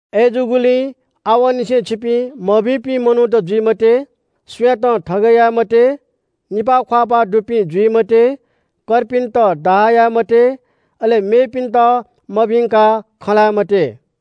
अय्‌जूगुलिं आवंनिसें छिपिं मभिंपिं मनूत जुइ मते। सुयातं थगय् याये मते, निपाः ख्‍वाःपाः दुपिं जुइ मते, कर्पिन्‍त डाहा याये मते, अले मेपिन्‍त मभिंकाः खँ ल्‍हाये मते।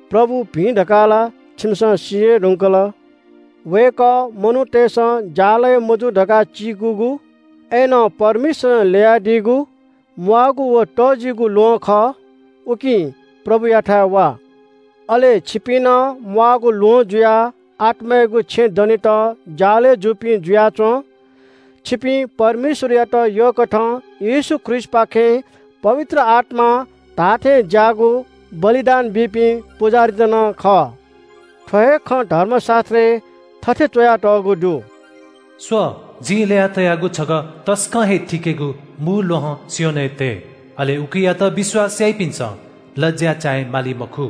प्रभु भिं धकाः ला छिमिसं सी हे धुंकल। वय्‌कः मनूतय्‌सं ज्‍यालगय् मजू धकाः चीकूगु, अय्‌नं परमेश्‍वरं ल्‍ययादीगु, म्‍वाःगु व तःजिगु ल्‍वहं खः। उकिं प्रभुयाथाय् वा। अले छिपिं नं म्‍वाःगु ल्‍वहं जुयाः आत्‍मायागु छेँ दनेत ज्‍यालगय् जूपिं जुयाच्‍वँ। छिपिं परमेश्‍वरयात यःकथं येशू ख्रीष्‍टपाखें पवित्र आत्‍मां धाःथेंज्‍याःगु बलिदान बीपिं पुजाहारीत नं खः। थ्‍व हे खँ धर्मशास्‍त्रय् थथे च्‍वयातःगु दु – “स्‍व, जिं ल्‍यया तयागु छगः तसकं हे थिकेगु मू ल्‍वहं सियोनय् तये, अले उकियात विश्‍वास याःपिन्‍सं लज्‍या चाये माली मखु।”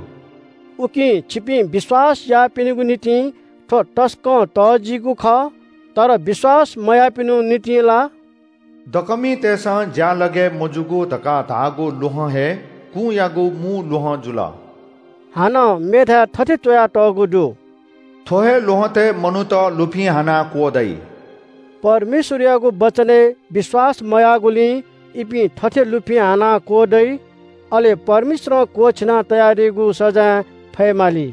उकिं छिपिं विश्‍वास याःपिनिगु निंतिं थ्‍व तसकं तःजिगु खः। तर विश्‍वास मयाःपिनिगु निंतिं ला – “दकःमितय्‌सं ज्‍यालगय् मजूगु धकाः धाःगु ल्‍वहं हे कुंयागु मू ल्‍वहं जुल।” हानं मेथाय् थथे च्‍वयातःगु दु – “थ्‍व हे ल्‍वहँतय् मनूत लुफिं हानाः क्‍वदइ।” परमेश्‍वरयागु वचनय् विश्‍वास मयाःगुलिं इपिं थथे लुफिं हानाः क्‍वदइ। अले परमेश्‍वरं क्‍वःछिना तयादीगु सजाँय फयेमाली।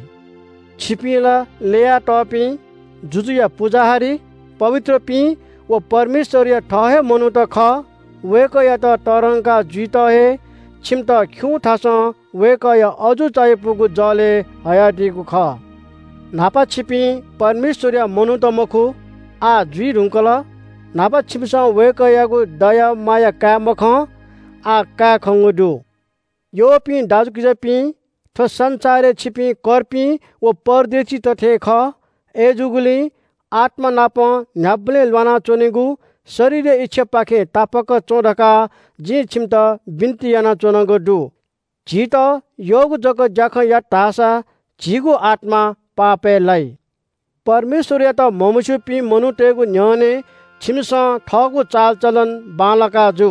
छिपिं ला ल्‍ययातःपिं, जुजुया पुजाहारी, पवित्रपिं व परमेश्‍वरया थः हे मनूत खः। वय्‌कःयात तःधंका जुइत हे छिमित खिउँथासं वय्‌कःया अजू चायापुगु जलय् हयादीगु खः। न्‍हापा छिपिं परमेश्‍वरया मनूत मखु, आः जुइ धुंकल। न्‍हापा छिमिसं वय्‌कःयागु दया माया काये मखं, आः काये खंगु दु। यःपिं दाजुकिजापिं, थ्‍व संसारय् छिपिं कर्पिं व परदेशीत थें खः। अय्‌जूगुलिं आत्‍मानापं न्‍ह्याबलें ल्‍वाना च्‍वनीगु शरीरया इच्‍छापाखें तापाक च्‍वँ धकाः जिं छिमित बिन्‍ति यानाच्‍वनागु दु। झीत यःगु जक ज्‍याखँ यात धाःसा झीगु आत्‍मा पापय् लाइ। परमेश्‍वरयात म्‍हमस्‍यूपिं मनूतय्‌गु न्‍ह्यःने छिमिसं थःगु चालचलन बांलाका जु।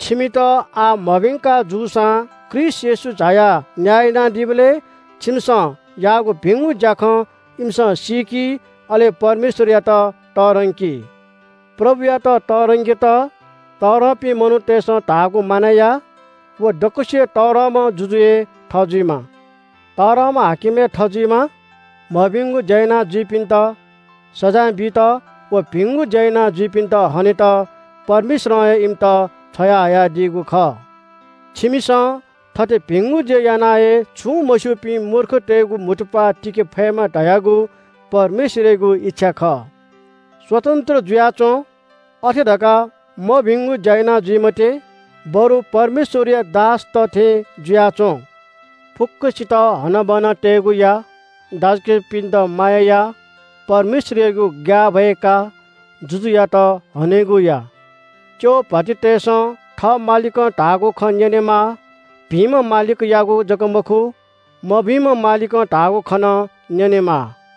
छिमित आः मभिंका जूसां ख्रीष्‍ट येशू झायाः न्‍याय यानादीबलय् छिमिसं याःगु भिंगु ज्‍याखँ इमिसं सीकी, अले परमेश्‍वरयात तःधंकी। प्रभुयात तःधंकेत तःधंपिं मनूतय्‌सं धाःगु मानय् या। व दक्‍वसिबय् तःधंम्‍ह जुजु हे थजुइमा, तःधंम्‍ह हाकिम हे थजुइमा। मभिंगु ज्‍या यानाजुइपिन्‍त सजाँय बीत व भिंगु ज्‍या यानाजुइपिन्‍त हनेत परमेश्‍वरं हे इमित छ्वयाहयादीगु खः। छिमिसं थथे भिंगु ज्‍या याना हे छुं मस्‍यूपिं मूर्खतय्‌गु म्‍हुतुप्‍वाः तिके फयेमा धयागु परमेश्‍वरयागु इच्‍छा खः। स्‍वतन्‍त्र जुयाच्‍वँ। अथे धकाः मभिंगु ज्‍या याना जुइ मते, बरु परमेश्‍वरया दासत थें जुयाच्‍वँ। फुक्‍कसित हनाबना तयेगु या। दाजुकिजापिन्‍त माया या। परमेश्‍वरयागु ग्‍याःभय का। जुजुयात हनेगु या। च्‍यः भ्‍वातिंतय्‌सं थः मालिकं धाःगु खँ न्‍यनेमाः। भिंम्‍ह मालिकयागु जक मखु, मभिंम्‍ह मालिकं धाःगु खँ नं न्‍यनेमाः।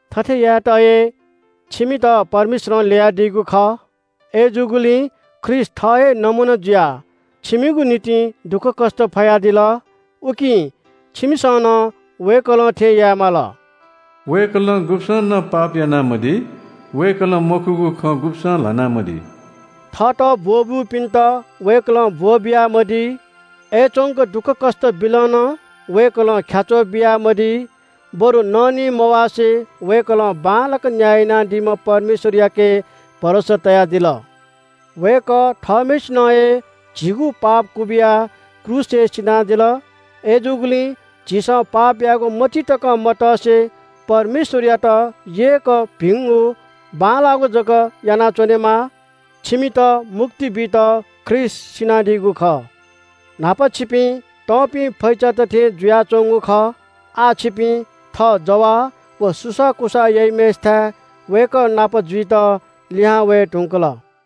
थथे यायेत हे छिमित परमेश्‍वरं ल्‍ययादीगु खः। अय्‌जूगुलिं ख्रीष्‍ट थः हे नमूना जुयाः छिमिगु निंतिं दुःखकष्‍ट फयादिल। उकिं छिमिसं नं वय्‌कलं थें याये माल। “वय्‌कलं गुब्‍सं नं पाप यानामदी। वय्‌कलं मखुगु खँ गुब्‍सं ल्‍हानामदी।” थःत ब्‍वः ब्‍यूपिन्‍त वय्‌कलं ब्‍वः बियामदी। अय्‌च्‍वंक दुःखकष्‍ट बिलं नं वय्‌कलं ख्‍याच्‍वः बियामदी, बरु ननिमवासे वय्‌कलं बांलाक न्‍याय यानादीम्‍ह परमेश्‍वरयाके भरोसा तयादिल। वय्‌कः थःम्‍हय्‌सिनं हे झीगु पाप क्‍वबिया क्रूसय् सिनादिल। अय्‌जूगुलिं झीसं पाप यायेगु मतिइ तकं मतसे परमेश्‍वरयात यय्‌क भिंगु बांलाःगु जक यानाच्‍वनेमाः। छिमित मुक्ति बीत ख्रीष्‍ट सिनादीगु खः। न्‍हापा छिपिं तंपिं फैचात थें जुयाच्‍वंगु खः। आः छिपिं थः जवाः व सुसाःकुसाः याइम्‍हय्‌सिथाय् वय्‌कः नाप जुइत लिहां वये धुंकल।